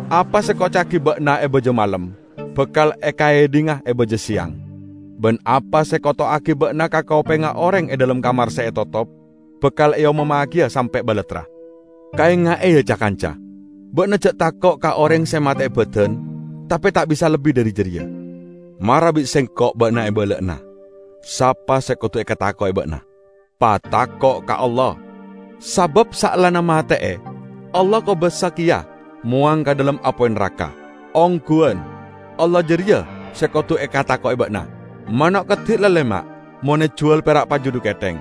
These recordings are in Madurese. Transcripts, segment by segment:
Apa se ekoca'agi ba'na e baja malem, bakal ekaedhinga e baja seyang; ban apa se ekoto'agi ba'na ka kopengnga oreng e dhalem kamar se etotop, bakal eomommagiya sampe' balattra." "Kaenga'e, ya, ca-kanca! Ba'na ja' tako' ka oreng se mate'e badan tape ta' bisa lebbi dhari jareya. Mara bi' Sengko' ba'na ebala'ana sapa se kodu ekatako'e ba'na. Patako' ka Allah! Sabab saellana mate'e, Allah kobasa keya mowang ka dhalem apoy naraka! Ongguwan, Allah jareya se kodu ekatako'e ba'na. Mano' keddi' lalema' mon ejuwal pera' paju dhu ketheng.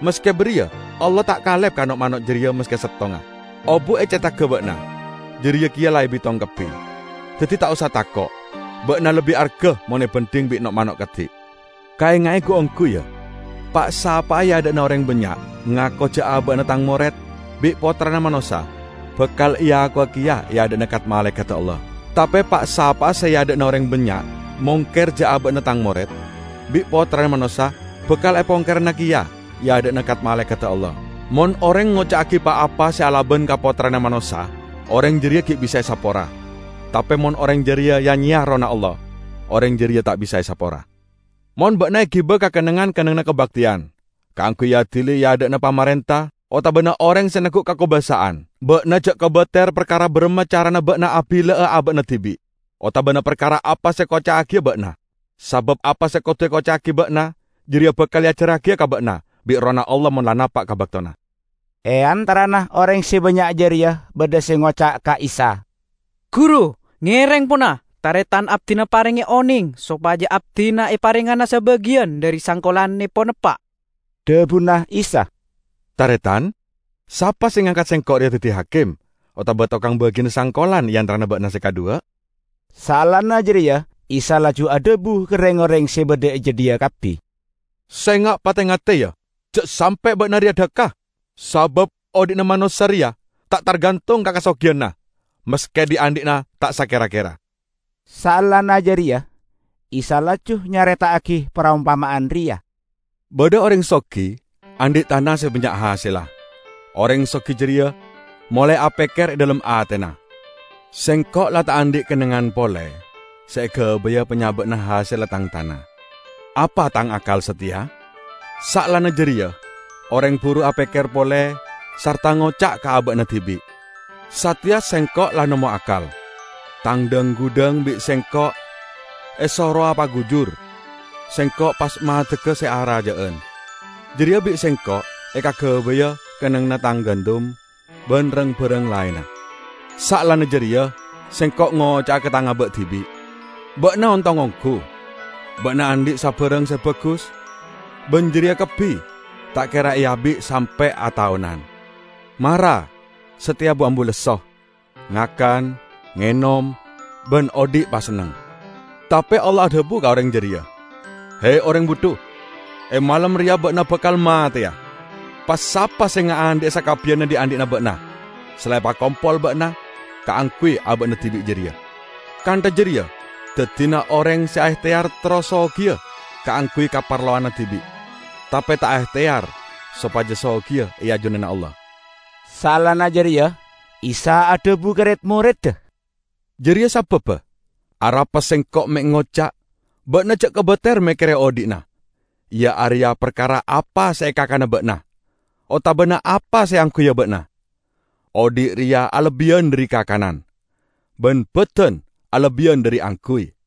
Maske bariya Allah ta' kalep ka no'-mano' jareya maske settonga. Obu' e cethagga ba'na jareya keya la ebitong kabbi. Daddi ta' osa tako'; ba'na lebbi arga mon ebandhing bi' no'-mano' keddi'!" "Kaenga'e gu-onggu, ya: Pa'-sapa'a e adha'na oreng bannya' ngako ja' aba'na Tang mored, bi' Pottrana Manossa bakal eakowa keya e adha'na kat-malaekadda Allah. Tape pa'-sapa'a se e adha'na oreng bannya' mongker ja' aba'na Tang mored, bi' Pottrana Manossa bakal epongkerana keya e adha'na kat-malaekadda Allah. Mon oreng ngoca'agi pa-apa se alaban ka Pottrana Manossa oreng jareya gi' bisa esapora; tape mon oreng jareya ya-nyeya Errohna Allah, oreng jareya ta' bisa esapora. Mon ba'na egiba ka kennengngan-kennengnganna kabakteyan kaangguy eadili e adha'na pamarenta otabana oreng se neggu' kakobasa'an, ba'na ja' kobater parkara baramma carana ba'na abilla'a aba'na dibi' otabana parkara apa se ekoca'agiya ba'na. Sabab apa se kodu ekoca'agi ba'na jareya bakal eajarragiya ka ba'na bi' Errohna Allah mon la napa' ka baktona." E antarana oreng se bannya' jareya badha se ngoca' ka Isa, "Guru, ngereng, pona, taretan abdina parenge oneng sopaja abdina eparengngana sabagiyan dhari sangkolannepon eppa'." Dhabuna Isa, "Taretan, sapa se ngangkat Sengko' reya daddi hakim otaba tokang bagina sangkolan e antarana ba'na se kadhuwa?" Saellana jareya Isa laju adhabu ka reng-oreng se badha e jadhiya kabbi, "Senga' pate-ngate, ya, ja' sampe' ba'na reya dhakka. Sabab odhi'na manossa reya ta' targantong ka kasogiyanna, maske dhi'-andhi'na ta' sakera-kera." Saellana jareya Isa laju nyareta'agi parompama'an reya, "Badha oreng sogi, andhi' tana se bannya' hasella. Oreng sogi jareya molae apekker e dhalem atena, 'Sengko' la ta' andhi' kennengngan pole se egabaya panyaba'anna hasella tang tana. Apa tang akkal sateya?' Saellana jareya oreng buru apekker pole sarta ngoca' ka aba'na dibi', 'Sateya sengko' la nemmo akkal; tang dhang-gudhang bi' sengko' esorowa pagujur, sengko' pas maddegga se araja'an. Jareya bi' sengko' ekagabaya kennengnganna tang gandum ban rang-barang laenna. Saellana jareya sengko' ngoca'a ka tang aba' dibi': Ba'na ontong onggu! Ba'na andhi' sabarang se bagus, ban jareya kabbi ta' kera eabi' sampe' ataonan. Mara sateya bu-ambu lesso! Ngakan, ngenom, ban odhi' pasenneng!' Tape Allah adhabu ka oreng jareya, 'He, oreng budhu! E malem reya ba'na bakal mateya, pas sapa se ngaandhi'a sakabbiyanna dhi'-andhi'na ba'na se la epakompol ba'na kaangguy aba'na dibi' jareya?' Kantha jareya daddina oreng se aehteyar terro sogiya kaangguy kaparlowanna dibi', tape ta' aehteyar sopaja sogiya e ajunanna Allah." Saellana jareya Isa adhabu ka red-moredda, "Jareya sababba arapa Sengko' me' ngoca' 'Ba'na ja' kobater mekkere odhi'na, iya areya parkara apa se ekakana ba'na, otabana apa se eangguya ba'na.' Odhi' reya alebbiyan dhari kakanan, ban badan alebbiyan dhari angguy.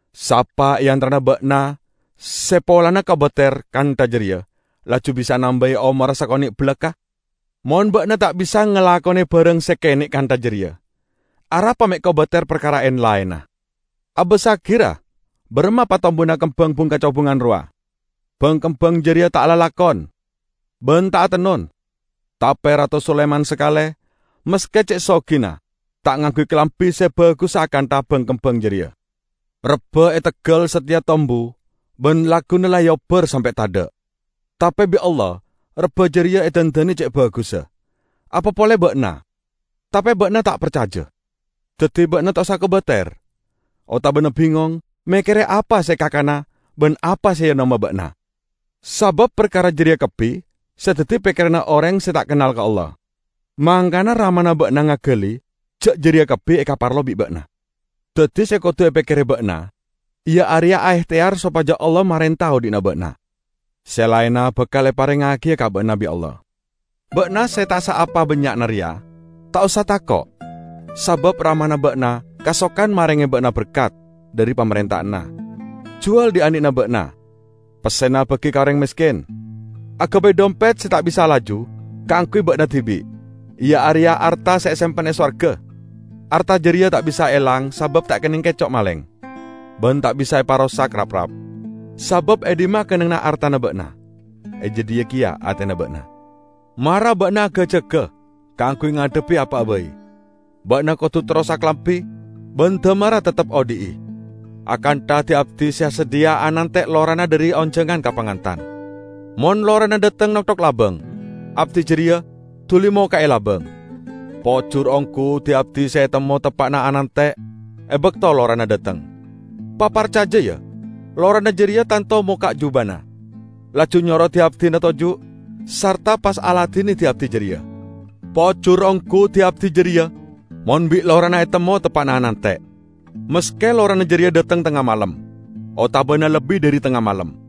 Sapa e antarana ba'na se polana kobater kantha jareya laju bisa nambai omorra sakone' balakka'? Mon ba'na ta' bisa ngalakone barang se kene' kantha jareya, arapa me' kobater parkara en-laenna? Abassagi, ra, baramma patombuna kembang bung-kacobungan rowa; bang-kembang jareya ta' alalakon, ban ta' atennon. Tape Rato Sulaiman sakale, maske ce' sogina, ta' ngangguy kalambi se bagussa akantha bang-kembang jareya! Rebba e teggal sateya tombu ban lagguna la eobbar sampe' tadha'. Tape bi' Allah rebba jareya edandane ce' bagussa. Apa pole ba'na! Tape ba'na ta' parcaja! Daddi, ba'na ta' osa kobater otabana bingong mekkere apa se ekakana ban apa se eenoma ba'na. Sabab parkara jareya kabbi se daddi pekkeranna oreng se ta' kennal ka Allah. Mangkana Ramana ba'na ngagali ja' jareya kabbi ekaparlo bi' ba'na. Daddi se kodu epekkere ba'na iya areya aehteyar sopaja Allah marenta odhi'na ba'na, se laenna bakal eparengngagiya ka ba'na bi' Allah." "Ba'na se ta' saapa bannya'na reya, ta' osa tako'! Sabab Ramana ba'na kasokan marenge ba'na berkat dhari Pamarenta'anna. Juwal dhi'-andhi'na ba'na, pessena bagi ka oreng mesken. Agabay dhompet se ta' bisa laju kaangguy ba'na dibi', iya areya arta se esempen e sowarga. Arta jareya ta' bisa elang sabab ta' ekenneng keco' maleng ban ta' bisa eparosak raprap. Sabab e dhimma kennengnganna artana ba'na, e jadhiya keya atena ba'na!" "Mara ba'na aga-jaga kaangguy ngadhebbi apa'a bai. Ba'na kodu terros akalambi ban damarra teptep odhi'i, akantha di-abdi se asadhiya anante' lorana dhari onjangan ka pangantan. Mon lorana dhateng nokthok labang, abdi jareya duli mokka'e labang. Pojur onggu di-abdi se etemmo teppa'na anante' e bakto lorana dhateng. Paparcaja, ya: lorana jareya tanto mokka' jubana, laju nyoro di-abdina toju', sarta pas aladine di-abdi jareya. Pojur onggu di-abdi jareya mon bi' lorana etemmo teppa'na anante', maske lorana jareya dhateng tengnga malem otabana lebbi dhari tengnga malem!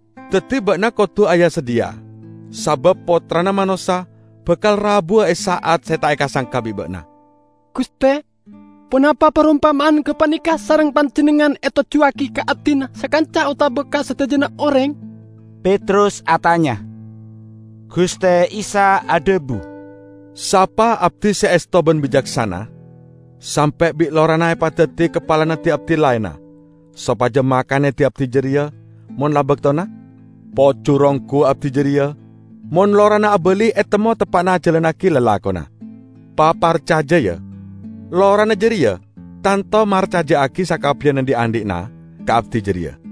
Daddi ba'na kodu aya-sadhiya, sabab Pottrana Manossa bakal rabuwa e sa'at se ta' eka-sangka bi' ba'na." "Guste, ponapa parompama'an gapaneka sareng Panjennengngan etojjuwagi ka abdina sakanca otaba ka sadajana oreng?" Petrus atanya. Guste Isa adhabu, "Sapa abdi se esto ban bicaksana, sampe' bi' lorana epadaddi kapalana di-abdi laenna sopaja makane di-abdi jareya mon la baktona? Pojur onggu abdi jareya mon lorana abali etemmo teppa'na ajalannagi lalakonna! Paparcaja, ya: Lorana jareya tanto marcaja'agi sakabbiyanna dhi'-andhi'na ka abdi jareya.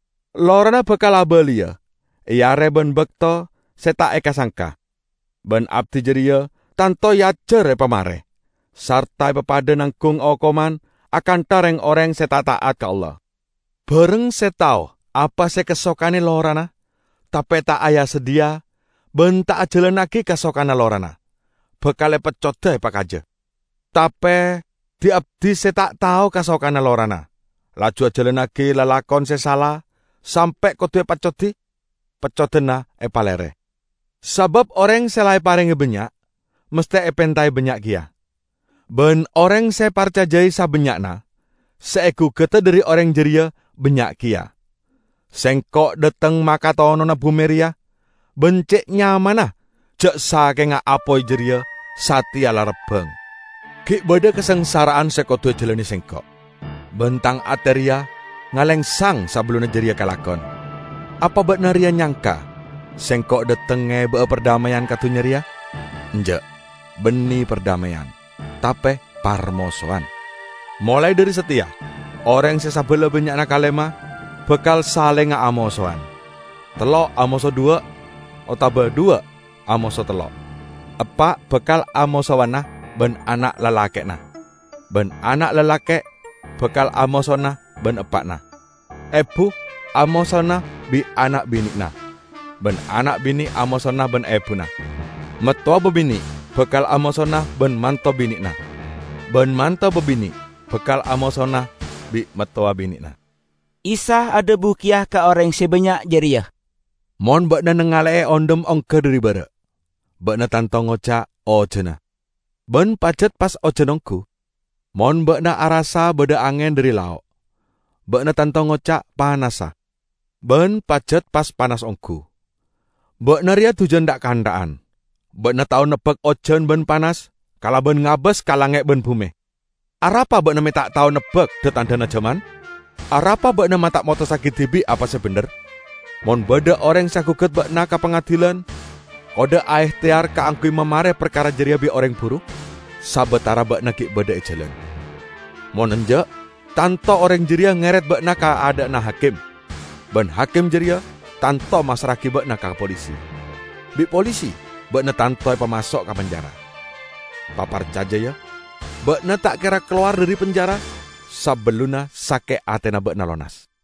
lorana bakal abaliya e are ban bakto se ta' eka-sangka. Ban abdi jareya tanto eajar epamare sarta epapadha nanggung okoman akantha reng-oreng se ta' ta'at ka Allah. Bareng se tao apa se ekasokane lorana, tape ta' aya-sadhiya ban ta' ajalannagi kasokanna lorana, bakal epeccoda epakaja. Tape di-abdi se ta' tao kasokanna lorana, laju ajalannagi lalakon se sala sampe' kodu epeccodi, peccodanna epalere. Sabab oreng se la eparenge bannya', masthe epentae bannya' keya. Ban oreng se eparcajai sabannya'na se egugada dhari oreng jareya bannya' keya." "Sengko' dhateng makatonona bume reya, ban ce' nyamanna ja' sakenga apoy jareya sateya la rabbang! Gi' badha kasangsara'an se kodu ejalane Sengko'. Ban Tang ate reya ngalengsang sabellunna jareya kalakon. Apa ba'na reya nyangka Sengko' dhateng ngeba'a pardhameyan ka dunnya reya? Enja', banne pardhameyan, tape parmosowan. Molae dhari sateya oreng se sabala bannya'na kalema bakal salenga amosowan, tello' amoso dhuwa' otaba dhuwa' amoso tello'. Eppa' bakal amosowana ban ana' lalake'na, ban ana' lalake' bakal amosowana ban eppa'na. Ebu amosowana bi' ana' bine'na ban ana' bine' amosowana ban ebuna. Mattowa babine' bakal amosowana ban manto bine'na, ban manto babine' bakal amosowana bi' mattowa bine'na." Isa adhabu keya ka oreng se bannya' jareya, "Mon ba'na nangale'e ondhem ongga dhari bara', ba'na tanto ngoca', 'Ojana.' Ban pajat pas ojan onggu. Mon ba'na arassa badha angen dhari lao', ba'na tanto ngoca', 'Panasa.' Ban pajat pas panas onggu. Ba'na reya dujan tha'-kantha'an! Ba'na tao nebbak ojan ban panas kalaban ngabas ka langnge' ban bume. Arapa ba'na me' ta' tao nebbak dha-tandhana jaman?" "Arapa ba'na ma' ta' motossagi dibi' apa se bendher? Mon badha oreng se agugat ba'na ka pangadilan, kodda' aehteyar kaangguy mamare parkara jareya bi' oreng buru sabatara ba'na gi' badha e jalan. Mon enja' tanto oreng jareya ngeret ba'na ka adha'na hakim, ban hakim jareya tanto massra'agi ba'na ka polisi. Bi' polisi ba'na tanto epamaso' ka penjara. Paparcaja, ya! Ba'na ta' kera kalowar dhari penjara sabellunna sake' atena ba'na lonas."